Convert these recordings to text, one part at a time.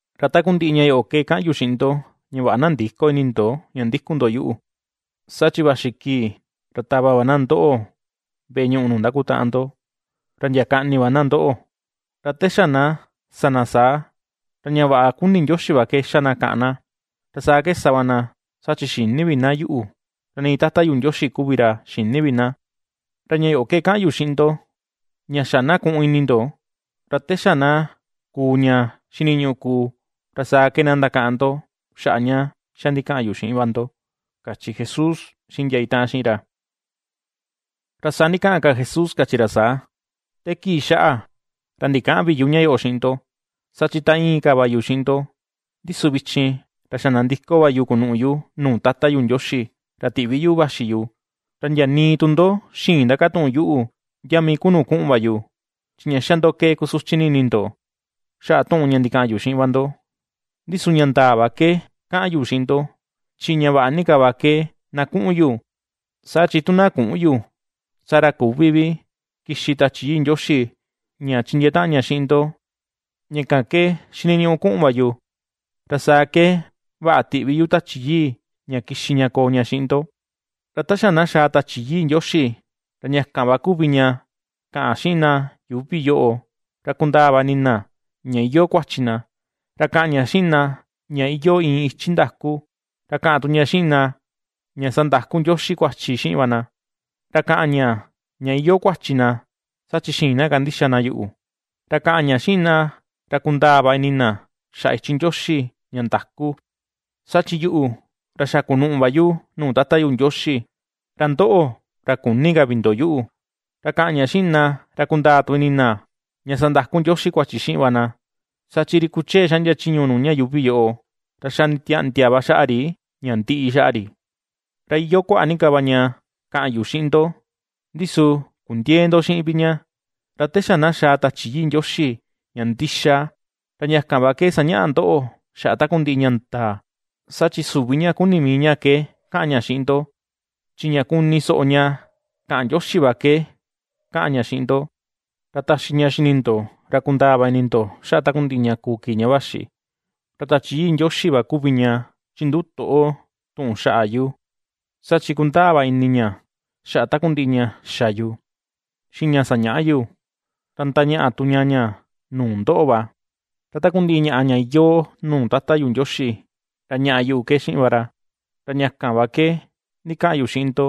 ’Ra takundiꞌi ña yoꞌo ke kaꞌan yu xiꞌin ndo, ña vaꞌa na ndïko ini ndo ña ndikun ndo yuꞌu. Saa chi vaxi kii, ra tava va na ndoꞌo veꞌe ñuꞌu nuu ndakitaꞌan ndo, ra ndia kaꞌni va na ndoꞌo, ra ta xa na ^sa na saa, ra ña vaꞌa kuni Ndioxi va ke ^xa na kàꞌàn na. Ra saa ke sa va na, saa chi xïni vi na yuꞌu, ra nii Tata yu Ndioxi kuvi ra xïni vi na. Ra ña yoꞌo ke kaꞌan yu xiꞌin ndo ña xa na ku̱ꞌu̱n ini ndo, ra te xa na kuu ña xiniñuꞌu kuu, ra saa ke na ndakaꞌan ndo xaꞌa ña xa ndikaꞌan yu xiꞌin va ndo ―kachi Jesús xiꞌin ndia itaꞌan xiꞌin ra. Ra saa ndikaꞌan ka Jesús kachi ra saa: ―Te kii xaꞌa, ra ndikäꞌan vi yu ña yoꞌo xiꞌin ndo, saa chi ta íin ka va yu xiꞌin ndo. Ndi su vichin, ra xa nandiko va yu kunuꞌu yu nuu Tata yu Ndioxi ra tiꞌvi yuꞌu vaxi yu, ra ndia nii tu ndo xïin ndakatuꞌun yuꞌu ndia mii ku nuu kuꞌun va yu. Chi ña xa ndo ke kusuchi ni ini ndo, xaꞌa tuꞌun ña ndikaꞌan yu xiꞌin va ndo. Ndi su ña ndaa va ke kaꞌan yu xiꞌin ndo: chi ña vaꞌa ni ka va ke na kuꞌun yu, saa chi tu na küꞌun yu, saa ra küvi vi kixi Tachi Yii Ndioxi ña chindiee taꞌan ña xiꞌin ndo, ña kan ke xiniñuꞌu kuꞌun va yu, ra saa ke vaꞌa tiꞌvi yu Tachi Yii, ña kixi ña koo ña xiꞌin ndo. Ra ta xa na xaa Tachi Yii Ndioxi, ra ña kan va kuvi ña kaꞌan xiꞌin na yuuvi yoꞌo, ra kundaa va ini na ña iyoo kuachi na, ra kaꞌan ña xiꞌin na ña iyoo iin ichi ndaku, ra kaꞌan tu ña xiꞌin na, ña sandaku Ndioxi kuachi xiꞌin va na. Ra kaꞌan ña, ña iyoo kuachi na, saa chi xïin na kandixa na yuꞌu; ra kaꞌan ña xiꞌin na ra kundaa va ini na xaꞌa ichi Ndioxi ña ndaku, saa chi yuꞌu, ra xa kunuꞌu va yu nuu Tata yu Ndioxi, ra ndoꞌo, ra küni ka vi ndo yuꞌu; ra kaꞌan ña xiꞌin na ra kundaa tu ini na, ña sandaku Ndioxi kuachi xiꞌin va na, saa chi ri kuchee xaꞌndia chiñu nuu ña yuuvi yoꞌo, ra xa nditiaꞌndia va xaꞌa ri ña ndiꞌi xaꞌa ri. ’Ra iyoo kuaꞌa ni ka va ña kaꞌan yu xiꞌin ndo, ndi su kundiëe ndo xiꞌin vi ña. Ra te xa na xa̱a̱ Tachi Yii Ndioxi ña ndixa, ra ña kan va ke sañaꞌa ndoꞌo xaꞌa takundiꞌi ña ndaa; saa chi süvi ña kuni mii ña ke kaꞌan ña xiꞌin ndo, chi ña kuni soꞌo ña kaꞌan Ndioxi va ke kaꞌan ña xiꞌin ndo, ra taxi ña xini ndo, ra kundaa va ini ndo xaꞌa takundiꞌi ña kuu kii ña vaxi. Ra Tachi Yii Ndioxi va kuvi ña chinduꞌu toꞌo tuꞌun xaꞌa yu, saa chi ^kundaa va ini ña xaꞌa takundiꞌi ña xa yu, xiꞌin ña sañaꞌa yu, ra ndañaꞌa tu ña ña nuu ndoꞌo va. Ra takundiꞌi ñaꞌa ña iyoo nuu Tata yu Ndioxi, ra ñaꞌa yuꞌu ke xiꞌin va ra. Ra ña kan va ke ndikaꞌan yu xiꞌin ndo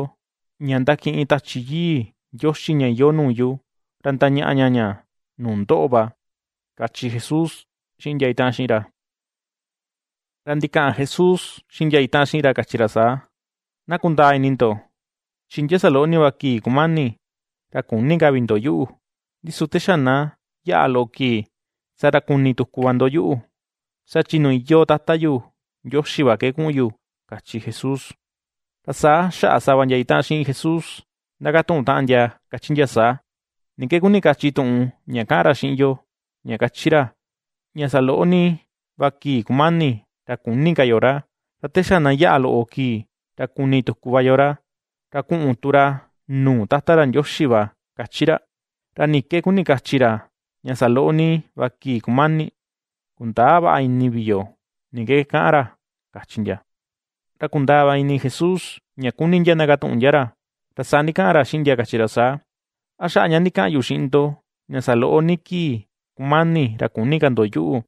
ña ndakiꞌin Tachi Yii Ndioxi ña iyoo nuu yu, ra ndañaꞌa ña ña nuu ndoꞌo va ―kachi Jesús xiꞌin ndia itaꞌan xiꞌin ra. Ra ndikaꞌan Jesús xiꞌin ndia itaꞌan xiꞌin ra kachi ra saa: ―Na kundaa ini ndo, chi ndia saloꞌo ni va kii kumani, ra küni ka vi ndo yuꞌu, ndi su te xa na yaꞌa loꞌo kii, saa ra kuni tuku va ndo yuꞌu, saa chi nuu iyoo Tata yu Ndioxi va ke kuꞌun yu ―kachi Jesús. Ra saa xaꞌa sava ndia itaꞌan xiꞌin Jesús ndakatuꞌun taꞌan ndia kachi ndia saa: ―¿Ni ke kuni kachi tuꞌun ña kaꞌan ra xiꞌin yo, ña kachi ra, ña saloꞌo ni va kii kumani ra küni ka yo ra, ra te xa na yaꞌa loꞌo kii, ra kuni tuku va yo ra, ra kuꞌun tu ra nuu Tata ra Ndioxi va kachi ra? ¿Ra ni ke kuni kachi ra, “ña saloꞌo ni va kii kumani”? Kundäa vaꞌa ini vi yo ni ke kaꞌan ra ―kachi ndia. Ra kundaa va ini Jesús ña kuni ndia ndakatuꞌun ndia ra, ra saa ndikaꞌan ra xiꞌin ndia kachi ra saa: ―¿A xaꞌa ña ndikaꞌan yu xiꞌin ndo, ña saloꞌo ni kii kumani ra küni ka ndo yuꞌu,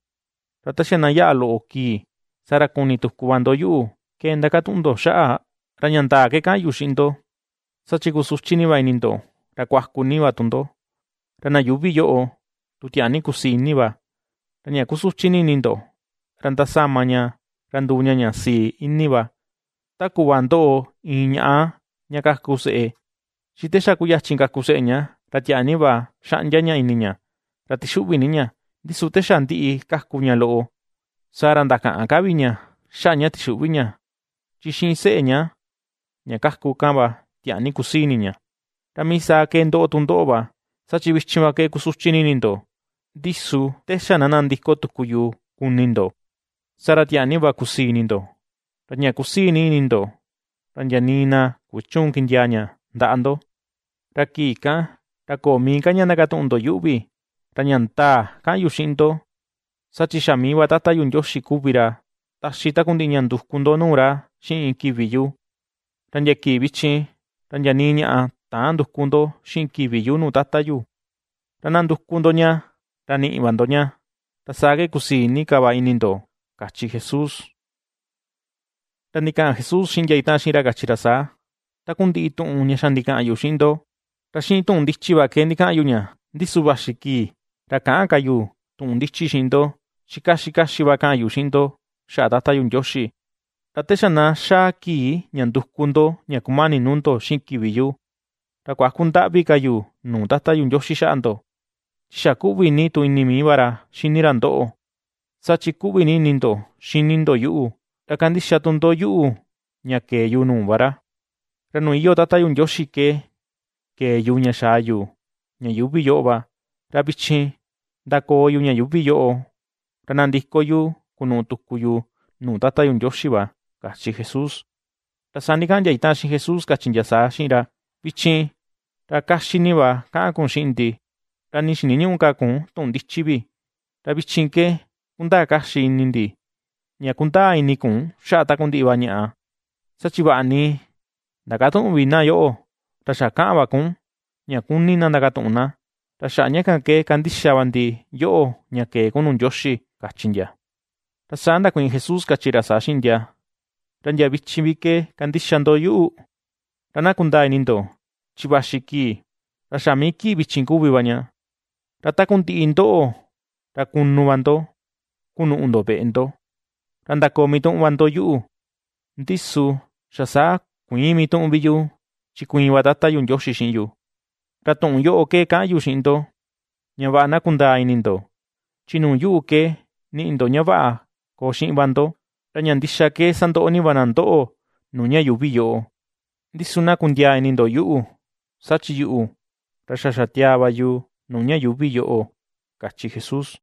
ra te xa na yaꞌa loꞌo kii, saa ra kuni tuku va ndo yuꞌu, ke ndakatuꞌun ndo xaꞌa? Ra ña ndaa ke kaꞌan yu xiꞌin ndo, saa chi kusuchi ni va ini ndo, ra kuaku ni va tu ndo, ra na yuuvi yoꞌo tu tiaa ni kusii ini va. Ra ña kusuchi ni ini ndo, ra ndasama ña ra nduu ña ña sii ini va. Ta kuꞌva ndoꞌo iin ñaꞌa ña kaku seꞌe, chi te xa kuyachin kaku seꞌe ña, ra tiaa ni va xaꞌndia ña ini ña, ra tixuꞌvi ni ña, ndi su te xa ndiꞌi kaku ña loꞌo, saa ra ndakäꞌan ka vi ña xaꞌa ña tixuꞌvi ña, chi xiꞌin seꞌe ña, ña kaku kan va tiaa ni kusii ini ña. Ra mii saa ke ^ndoꞌo tu ndoꞌo va; saa chi vichin va ke kusuchi ni ini ndo, ndi su te xa na nandiko tuku yu kuni ndo, saa ra tiaa nii va kusii ini ndo, ra ña kusii nii ini ndo, ra ndia nii na kuchüun kindiaa ña ndaꞌa ndo. ’Ra kii kan, ra köo mii ka ña ndakatuꞌun ndo yuꞌu vi. Ra ña ndaa kaꞌan yu xiꞌin ndo: saa chi xa mii va Tata yu Ndioxi kuvi ra taxi takundiꞌi ña nduku ndo nuu ra xiꞌin kivi yu. Ra ndia kii vichin, ra ndia nii ñaꞌa täan nduku ndo xiꞌin kivi yu nuu tata yu, ra na nduku ndo ña, ra niꞌi va ndo ña, ra saa ke kusii ni ka va ini ndo ―kachi Jesús. Ra ndikaꞌan Jesús xiꞌin ndia itaꞌan xiꞌin ra kachi ra saa: ―Takundiꞌi tuꞌun ña xa ndikaꞌan yu xiꞌin ndo, ra xiꞌin tuꞌun ndichi va ndikaꞌan yu ña; ndi su vaxi kii ra käꞌan ka yu tuꞌun ndichi xiꞌin ndo, chi kaxi kaxi va kaꞌan yu xiꞌin ndo xaꞌa Tata yu Ndioxi. Ra te xa na xaa kii ña nduku ndo ña kumani nuu ndo xiꞌin kivi yu, ra kuäku ndaꞌvi ka yu nuu Tata yu Ndioxi xaꞌa ndo, chi xa ^kuꞌvi ni tu ini mii va ra xini ra ndoꞌo, saa chi ^kuꞌvi ni ini ndo xini ndo yuꞌu, ra kandixa tu ndo yuꞌu ña kee yu nuu va ra. Ra nuu iyoo Tata yu Ndioxi ke kee yu ña xaa yu ña yuuvi yoꞌo va, ra vichin ndakoo yu ña yuuvi yoꞌo, ra nandiko yu kunuꞌu tuku yu nuu Tata yu Ndioxi va ―kachi Jesús. Ra saa ndikaꞌan ndia itaꞌan xiꞌin Jesús kachi ndia saa xiꞌin ra: ―Vichin, ra kaxi ni va kaꞌan kun xiꞌin ndi, ra nii xiniñüꞌu ka kun tuꞌun ndichi vi. Ra vichin ke kundaa kaxi ini ndi ña kundaa ini kun xaꞌa takundiꞌi va ñaꞌa, saa chi vaꞌa ni ndakatüꞌun vi na yoꞌo, ra xa kaꞌan va kun ña kuni na ndakatuꞌun na. Ra xaꞌa ña kan ke kandixa va ndi yoꞌo ña kee kun nuu Ndioxi ―kachi ndia. Ra saa ndakuiin Jesús kachi ra saa xiꞌin ndia: ―¿Ra ndia vichin vi ke kandixa ndo yuꞌu? Ra na kundaa ini ndo, chi vaxi kii, ra xa mii kii vichin kuvi va ña, ra takundiꞌi ndoꞌo, ra kunu va ndo kunuꞌu ndo veꞌe ndo, ra ndakoo mituꞌun va ndo yuꞌu. Ndi su xa saa kuïin mituꞌun vi yu, chi kuiin va Tata yu Ndioxi xiꞌin yu. Ra tuꞌun yoꞌo ke kaꞌan yu xiꞌin ndo, ña vaꞌa na kundaa ini ndo, chi nuu yuꞌu ke niꞌi ndo ña vaꞌa koo xiꞌin va ndo. Ra ña ndixa ke sandoꞌo ni va na ndoꞌo nuu ña yuuvi yoꞌo; ndi su na kundiaa ini ndo yuꞌu, saa chi yuꞌu, ra xa xatiaa va yu nuu ña yuuvi yoꞌo ―kachi Jesús.